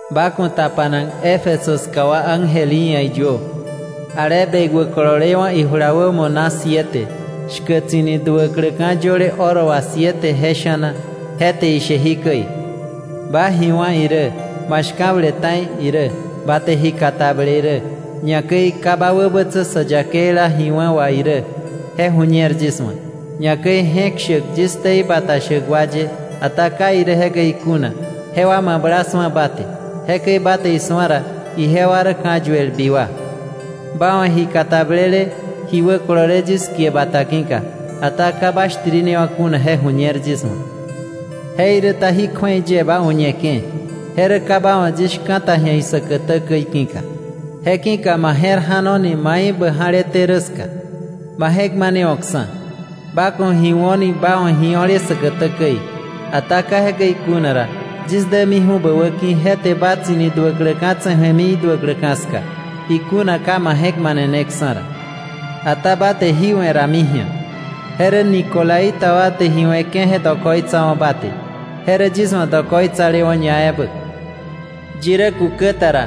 “Ba ku̱ tapanak Éfeso ska wa ángel í ia̱ iyuö: ‘Ale bekwä kololewa̱ ijula wämo naka siete, shkäk tsi̱ni duäkläka̱ yöle oro wà siete je sha̱na, je te ishe jikäi: Ba ji wá̱ irä, ma shka̱ble ta̱i irä, ba te ji katable irä, ñakäi ka ba wäbätsä sä yakeila ji wa̱ wà irä, je ju̱ñer yis wa̱, ñakäi je̱k shäk yis ktei bata shäk wa ye ata ka irä jekäi kuna, jewa mabla su̱a ba te, jekäi ba te isu̱a ra, ijewa rä ka̱yuelbi wa. Ba wa̱ ji katablele, ji wäkolole yis kie bata ki̱ka, ata ka ba shtirinewa̱ kuna, je ju̱ñer yis wa̱. Jeiräta jí kju̱ei yie ba uñeke̱, je rä ka ba wa̱ yis shka̱ta ji̱a säkätä käi ki̱ka. Je ki̱ka ba je̱r ja̱noni mai bä ja̱leté rä ska. Ba je̱k manewo̱ksa̱; ba ku̱ ji wo̱ni ba wa̱ io̱le säkätä käi. Ata ka jekäi kuna ra, yis dämiju̱ ba wäki̱, je te ba tsi̱ni duäkläka̱ tse̱ju̱emi iduäkläwa̱ ska, ikuna ka ma je̱k maneneksa̱ ra. Ata ba te jí we̱ rami ji̱a: je rä nicolaita wa te ji we̱ke̱ je dokoitsawa̱ ba te; je rä yis wa̱ dokoitsalewa̱ ñaebä. ¡Yi rä kukä ta ra,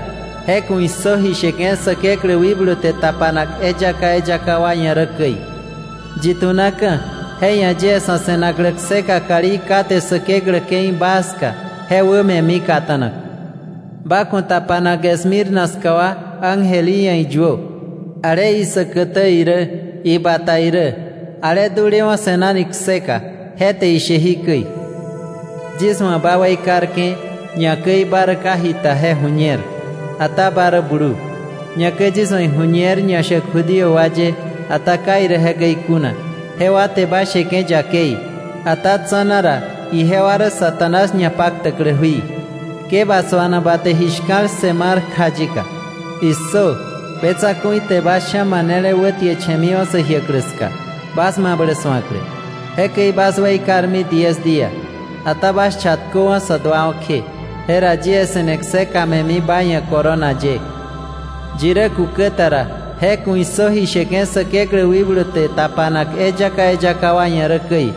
je ku̱ issö ji sheke̱ Säkeklä wikblu te tapanak eyaka eyaka wa ia̱ rä käi! Yi tu̱naka̱, je ia̱ yie sa̱ se̱naklä kseka kalí kate Säkeklä ke̱i baa ska je wä me̱mi kata̱nak.’ “Ba ku̱ tapanak Esmirna ska wa ángel í ia̱ iyuö: ‘Ale isäkätä irä, ibata irä, ale dulewa̱ se̱nani kseka, je te ishe jikäi: Yis wa̱ ba weikarke̱, ñakäi ba rä ka ji a̱ni ta je ju̱ñer; ata ba rä blu. Ñakäi yis wa̱ iju̱ñer ñashäk Judío wa ye, ata ka irä jekäi kuna, jewa te ba sheke̱ yakei, ata tsa̱na ra ijewa rä Satanás ñapaktäklä jui. Ke ba suanak ba te ji shka̱l ssë mar kja yika. ¡Issö! Be tsa̱ku̱i te bas sha̱ manele wätieche̱miwa̱ sä jiäklä ska, bas mablä su̱aklä. Jekäi bas weikarmi diez día, ata bas chatköwa̱ sä duawa̱ kje, jera yie se̱ne kseka me̱mi ba ia̱ corona ye. ¡Yi rä kukä ta ra, je ku̱ issö ji sheke̱ Säkeklä wikblu te tapanak eyaka eyaka wa ia̱ rä käi!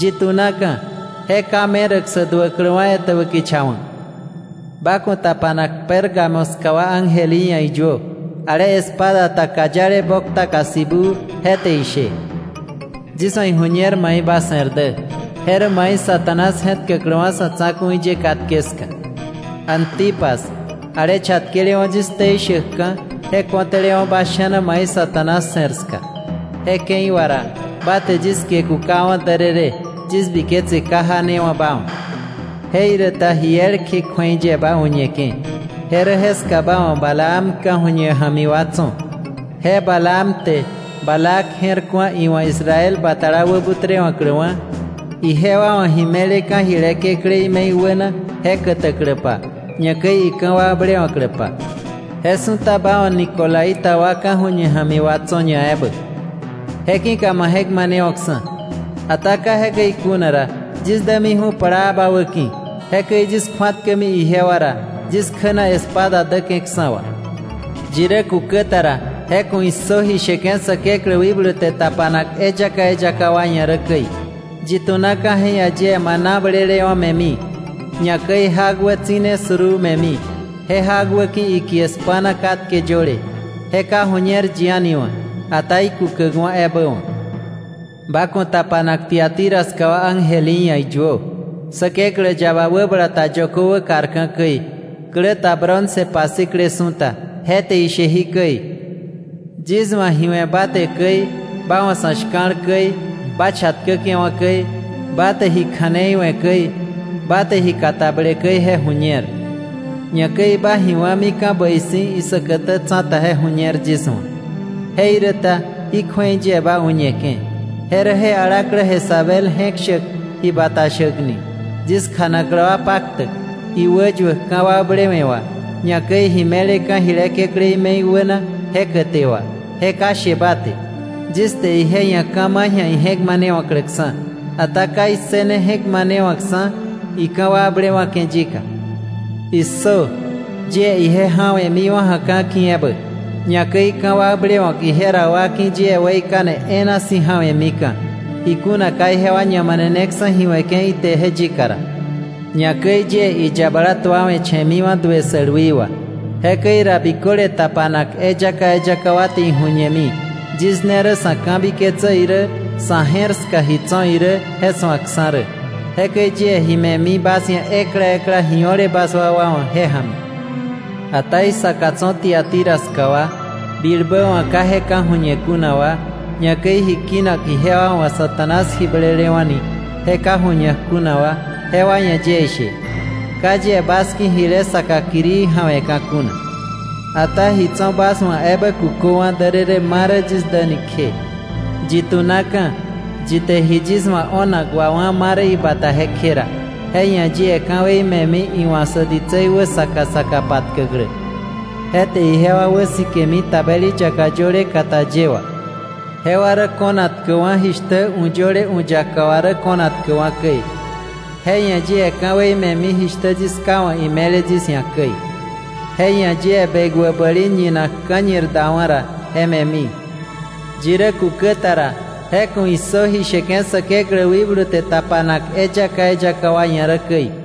Yi tu̱naka̱, je ka meräk sä duäkläwa̱ etäbä kicha wa̱.’ “Ba ku̱ tapanak Pérgamo ska wa ángel í ia̱ iyuö: ‘Ale espada ta kayale boktaka sibuu, je te ishe: Yis wa̱ iju̱ñer mai ba se̱r dä, je rä mai Satanás je̱tkäkläwa̱ sa̱ tsa̱ku̱i ye katke ska. Antipas, ale chatkelewa̱ yis ktei shäkka̱, je ko̱tälewa̱ bas sha̱na mai Satanás se̱r ska, je ke̱i wà ra ba te yis kie kukawa̱ därërë, yis biketse ka janewa̱ ba wa̱. Jeiräta ji elkje kju̱ei yie ba u̱ñeke̱: je rä jeska ba wa̱ Balaam ka̱ju̱ñe ja̱mi wa tso̱. Je Balaam te Balac je̱r ku̱a iwa̱ Israel batala wäbutrewa̱kläwa̱, ijewa wa̱ ji me̱leka̱ jile kekläí me̱i wäna je kätäkläpa, ñakäi ika̱wakblewa̱kläpa. Je su̱ta ba wa̱ nicolaita wa ka̱ju̱ñe ja̱mi wa tso̱ ñaebä. Je ki̱ka ma je̱k manewo̱ksa̱. Ata ka jekäi kuna ra, yis dämiju̱ plaa ba wäki̱, jekäi yis kju̱atkämi ijewa ra, yis kjä na espada däke̱ksa̱ wà. ¡Yi rä kukä ta ra, je ku̱ issö ji sheke̱ Säkeklä wikblu te tapanak eyaka eyaka wa ia̱ rä käi! Yi tu̱naka̱ je ia̱ yie maná blelewa̱ me̱mi. Ñakäi jak wä tsi̱ne suruu me̱mi, je jak wä ki̱ ikie spa̱na katke yöle, je ka ju̱ñer yi a̱ni wa̱, ata ikukäkwa̱ ebä wa̱.’ “Ba ku̱ tapanak Tiatira ska wa ángel í ia̱ iyuö: ‘Säkeklä yaba wäbala ta yökö wäkarka̱ käi, klä ta bronce pasikle su̱ta, je te ishe jikäi: Yis wa̱ ji we̱ ba te käi, ba wa̱ sa̱ shka̱l käi, ba chatkäke̱wa̱ käi, ba te ji kja̱nei we̱ käi, ba te ji katable käi je ju̱ñer. Ñakäi ba ji wá̱mika̱ bäi si̱, isäkätä tsa̱ta je ju̱ñer yis wa̱. Jeiräta jí kju̱ei yie ba u̱ñeke̱: je rä je alaklä Jezabel je̱k shäk ji bata shäk ni, yis kjanaklä wa paktäk, iwäyuäk ka̱wakblewe̱ wà, ñakäi ji me̱leka̱ jile kekläí me̱i wäna je käte wà, je ka she ba te. Yis te ije ia̱ ka̱ ma̱ ji̱a ije̱k manewa̱kläksa̱, ata ka issëne je̱k manewa̱kksa̱ ika̱wakblewa̱ke̱ yika. ¡Issö! Yie ije ja̱we̱miwa̱ ja̱ka̱ ki̱ ebä; ñakäi ka̱wakblewa̱k ije ra wa ki̱ yie weikane e̱e̱na si̱ ja̱we̱mika̱, ikuna ka ijewa ñamaneneksa̱ ji we̱ke̱ ije te yika ra. Ñakäi yie iyabala tuawe̱che̱miwa̱ duë sälwi wà. Jekäi ra biköle tapanak eyaka eyaka wa te iju̱ñemi yis ne rä sa̱ ka̱biketsä irä sa̱ je̱r ska ji tso̱ irä je su̱akksa̱ rä. Jekäi yie ji me̱mi bas ia̱ ekla ekla ji o̱le bas wakwa wa̱ je ja̱mi. Ata isaka tso̱ Tiatira ska wa, bilbä wa̱ ka je ka̱ju̱ñe kuna wa, ñakäi ji kinak ijewa wa̱ ‘Satanás ji blelewa̱’ ni je ka ju̱ñak kuna wa, jewa ia̱ yie ishe: Ka yie bas ki̱ jile saka kirii ja̱we̱ka̱ kuna. Ata ji tso̱ bas wa̱ ebä kuköwa̱ därërë ma rä yis däni kje. Yi tunaka̱, yi te ji yis wa̱ o̱nak wawá̱ ma rä ibata jekje ra, je ia̱ yie ka̱wei me̱mi iwa̱ sä ditsei wä saka saka patkäklä. Je te ijewa wäsikemi tabeli yaka yöle kata ye wà. Jewa rä ko̱nak tkäwa̱, jishtä u̱ yöle u̱ yaka wà rä ko̱nak tkäwa̱ käi. Je ia̱ yie ka̱wei me̱mi jishtä yis Ká wa̱ ime̱le yis ia̱ käi. Je ia̱ yie bekwä bäli ñinak ka̱ñir dawa̱ ra je me̱mi. ¡Yi rä kukä ta ra, je ku̱ issö ji sheke̱ Säkeklä wikblu te tapanak eyaka eyaka wa ia̱ rä käi!’